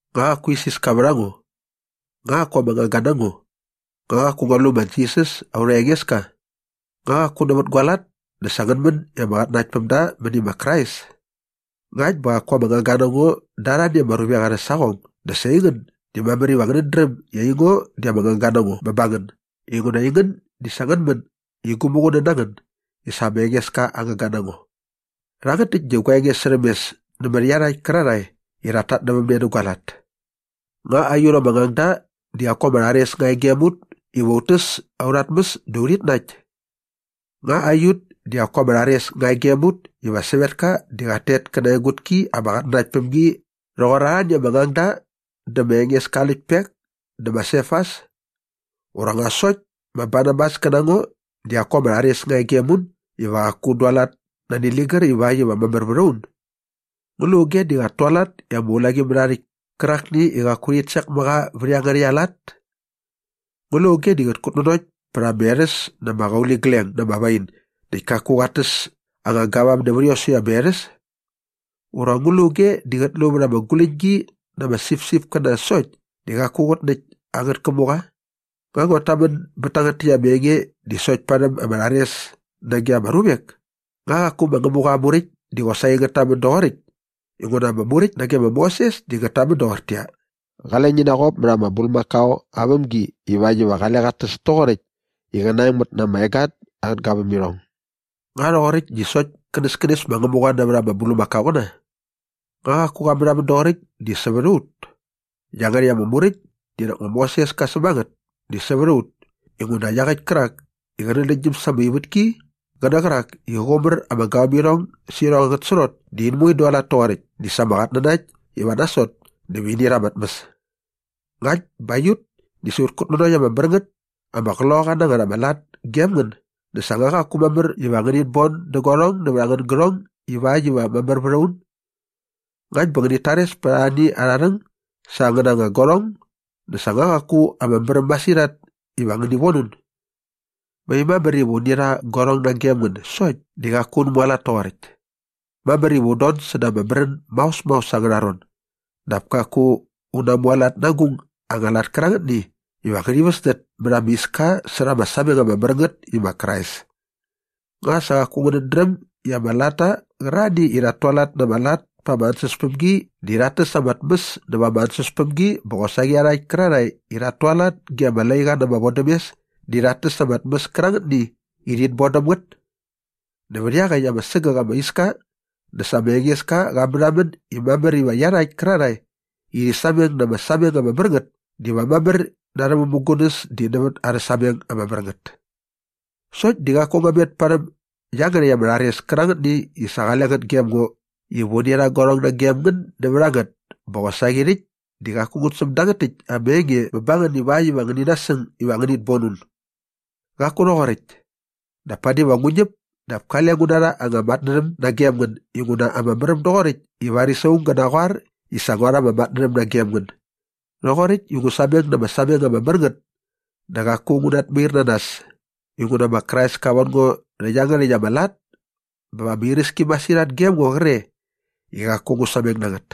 Nga qaku isiska vät a ngo? Nga qaku ama ngangga na ngo? Nga qaku ngua lu ma Jisas aurha Engeska? Nga qaku nävät gua lat dä sa ngän män i ama qatnanaktpämda mäni ma Krais? Ngakt bä qaku ama ngangga na ngo da arhani ama ruvek arhä saqong dä sa aingän di mamär iva ngänät dräm i aingo di ama ngangga na ngo bä ba ngän inguna aingän di sa ngän män i gu muqunän na ngän i sa ma Engeska aa ngangga na ngo. Rhangät täkt di gua enge särhäm mes nämät iarhakt kärarhae iva rhat tatnävämne nä gua lat. Nga aiut ama ngangda di qaku ama rhares nga e gem ut iva ut täs aurha tmäs dä urhit nakt? Nga aiut di qaku ama rhares nga e gem ut iva sävetka di qat tet kä na aa egutki ama qatnanakt päm gi rhoqor arhani ama ngangda dä ma Engeska aa läktpek dä ma Sefas? Ura nga sokt ma Barnabas kä na ngo di qaku ama rhares nga e gem un iva qaku un dualat nani ligär ivakt iva mamär vät a un? Ngu lu auge i qat tualat i ama ulaqimärhaarhäkt kärakni i qaku rhit sek mä qa vät iangärhäkt ama lat? Ngu lu auge di qät kutnanokt pät anga erhäs na ama qauligleng na ama wain näkt kaku qat täs anga gavam nävät iosäkt ama erhäs? Ura ngu lu auge di qät lu vät ama guläñgi na ama sipsipkäna sokt di qaku qät näkt angät kämuqa? Nga nguat tamän bät tangät täkt ama enge di sokt parhäm ama rhares nage ama ruvek? Nga qaku ma Ngämuqa aa Muräkt di qosaqi ngät tamän doqoräkt? Inguna ama Muräkt nage ma Moses di ngät tamän doqortäqyia, “Qale ngi naqop mät ama bulmakao aa vämgi ivakt iva qale qat täs toqoräkt i qä naengmät na ama egat angät gavämirhong.” Nga rhoqoräkt di sokt känäskänes ma Ngämuqa nävät ama bulmakaoqäna? Nga qaku qa märhamän doqoräkt di sävät a ut? Iangärhäkt ama muräkt di nak ma Moses ka säm a ngät di sävät a ut inguna iaqäkt kärak i qä nänläktgyäm sa ama ivätki qä nä qärak i qä qumär ama gavämirhong sä irhong angät srot di in moe in dualat toqoräkt di sa ama qatnanakt iva nasot dä va ini rha ama tmäs. Ngakt bä aiut di sa ut kutnanokt ama mär ngät ama qloqaqa na ngät ama lat gem ngän dä sa nga qaku mamär iva ngänit bon dä guarhong nävät angän gärhong ivakt iva mamär vät a ut? Ngakt bä ngänit tares pät arhani arha rhäng sa angäna anga guarhong dä sa nga qaku ama märäm masirhat iva ngäni von un? Mai mamär iva uni rha guarhong nagem ngän sokt di qaku un mualat toqoräkt. Mamär iva un don säda ama märän maos maos angärha ron dap kaku un namualat na agung anga lat kärangätni iva ngärhi väsdät mät ama iska särha ama sameng ama mär ngät i ma Krais. Nga sa qaku ngänät dräm i ama latta qärarhani i rhat tualat na ama lat pa ama ansäspämgi di rhat täs ama tmäs näva ama ansäspämgi bä qosaqi iarhakt kärarhae i rhat tualat ge ama laiqa na ama vodämes di rhat täs nävät ama tmäs kärangätni i rhit bon däm ngät? Nävät iaqäkt ama sägäk ama iska dä sa ma Engeska qa märhamän i mamär iva iarhakt kärarhae i rhi sameng na ama sameng ama mär ngät diva mamär na arhä mämugunäs di nävät ama sameng ama mär ngät. Sokt di qaku ngua met parhäm iangärhäkt ama rhares kärangätni i sa qale ngät gem ngo iva uni rha guarhong nagem ngän nävät a ngät bä qosaqi rhäkt di qaku ngut säm dangät täkt ama enge bä ba ngän ivakt iva ngäni nasäng iva ngänit bon un. Qaku rhoqoräkt. Dap padi va ngu ñäp dap kale ngu narha anga matnärhäm nagem ngän inguna ama märäm doqoräkt i varis aung gä naqoar i sa ngua rha ama matnärhäm nagem ngän. Rhoqoräkt i ngu sameng na ama sameng ama mär ngät dä qaku ngu natmair na nas inguna ma Krais ka von ngo rhä iangärhäkt ama lat bä va ama iräski masirhat gem ngo qre i qaku ngu sameng na ngät.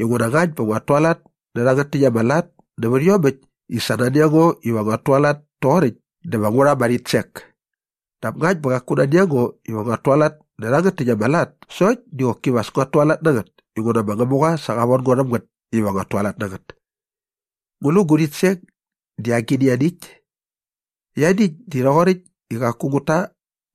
Inguna ngakt bä nguat tualat nä rhangät täkt ama lat nävät iomäkt i sa nani a ngo iva nguat tualat toqoräkt dä va ngu rha ama rhitsek. Dap ngakt bä qaku nani a ngo iva nguat tualat nä rhangät täkt ama lat sokt di qoki va as nguat tualat na ngät inguna ma Ngämuqa sa qa von ngo rhäm ngät iva nguat tualat na ngät. Ngu lu gu rhitsek di agini ianiäkt? Ianiäkt di rhoqoräkt i qaku ngut ta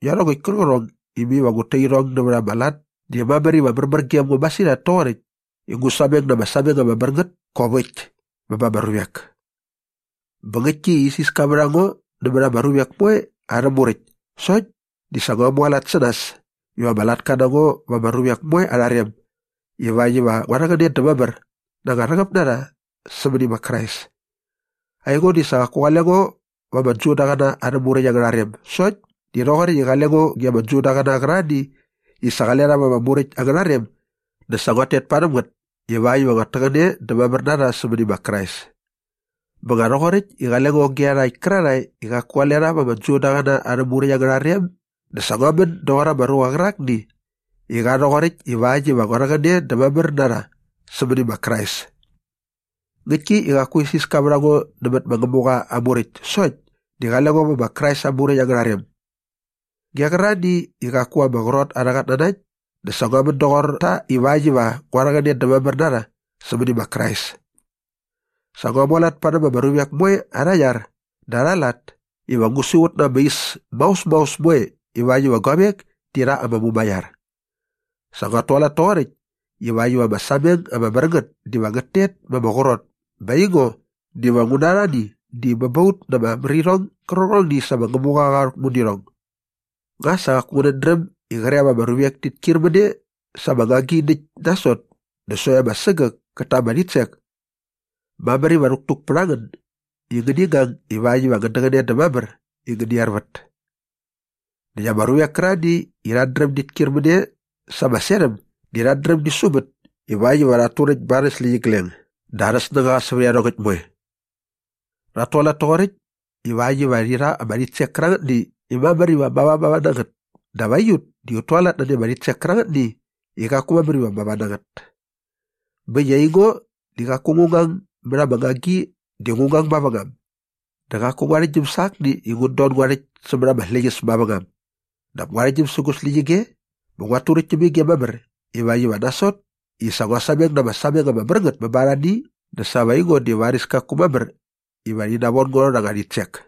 iarhongäkt kärqärhong i mai va ngut ta irhong nävät ama lat di mamär iva märmär gem ngo masirhat toqoräkt i ngu sameng na ama sameng ama mär ngät kop äkt bä ba ama ruvek. Bä ngäktki i isiska vät a ngo nämät ama ruvek moe arhä muräkt sokt di sa ngua mualat sä nas iva ama latka na ngo va ama ruvek moe arha rem ivakt iva ngua rhäqäne dä mamär na anga rhäqäp na rha sämäni ma Krais. Aingo di sa qaku qale ngo va ama Judaqäna arhä Muräkt angärha rem sokt di rhoqoräkt i qale ngo ge ama Judaqäna qärarhani i sa qale rha va ama Muräkt angärha rem dä sa nguat tet parhäm ngät ivakt iva nguat täqäne dä mamär na rha sämäni ma Krais. Bä nga rhoqoräkt i qale ngo ge iarhakt kärarhae i qaku qale rha va ama Judaqäna arhä Muräkt angärha rem dä sa ngua män doqor ama ruqa qärakni i qa rhoqoräkt ivakt iva ngua rhäqäne dä mamär na rha sämäni ma Krais. Ngäktki i qaku isiska vät a ngo nämät ma Ngämuqa aa Muräkt sokt di qale ngo vä ma Krais aa muräkt angärha rem. Ge qärarhani i qaku ama qrot arhä qatnanakt dä sa ngua män doqor ta ivakt iva ngua rhäqäne dä mamär na rha sämäni ma Krais. Sa ngua mualat parhäm ama ruvek moe arha iar dä arha lat iva ngu siqut na ama is maos maos moe ivakt iva guavek ti rha ama mumaiar. Sa nguat tualat toqoräkt ivakt iva ama sameng ama mär ngät diva ngät tet ma ama qrot bä aingo diva ngu na arhani di bä ba ut na ama märirhong gärqärhongni i sa ma Ngämuqa qa rhäkmu nä irhong. Nga sa qaku ngänät dräm i qre va ama ruvek tit kyir mä ne sa ama ngagi näkt nasot dä sokt ama sägäk kät ta ama rhitsek? Mamär iva rhäktuk pät a ngän i ngäni ngang ivakt iva ngän däqäne dä mamär i ngäni ervät. Näkt ama ruvek kärarhani i rhat dräm dit kyir mä ne sa ama serhäm di rhat dräm di sumät ivakt iva rhat turäkt ba arhä släqyigleng dä arhä snängaqa sävät iarhongäkt moe. Rhat tualat toqoräkt ivakt iva rhi rha ama rhitsek kärangätni i mamär iva mavamava na ngät dap aiut di ut tualat nani ama rhitsek kärangätni i qaku mamär iva mava na ngät. Bä äkt i aingo di qaku ngu ngang mät ama ngagi di ngu ngang mavängam dä qaku ngu arhäktgyäm sä akni i ngut don nä ngua rhäkt sämät ama släqyäs mavängam dap ngu arhäktgyäm sä gu släqyige bä nguat turäkt täm ige mamär ivakt iva nasot i sa ngua sameng na ama sameng ama mär ngät bä ba arhani dä sa va aingo di varis kaku mamär iva rhi navon ngo rha anga rhitsek.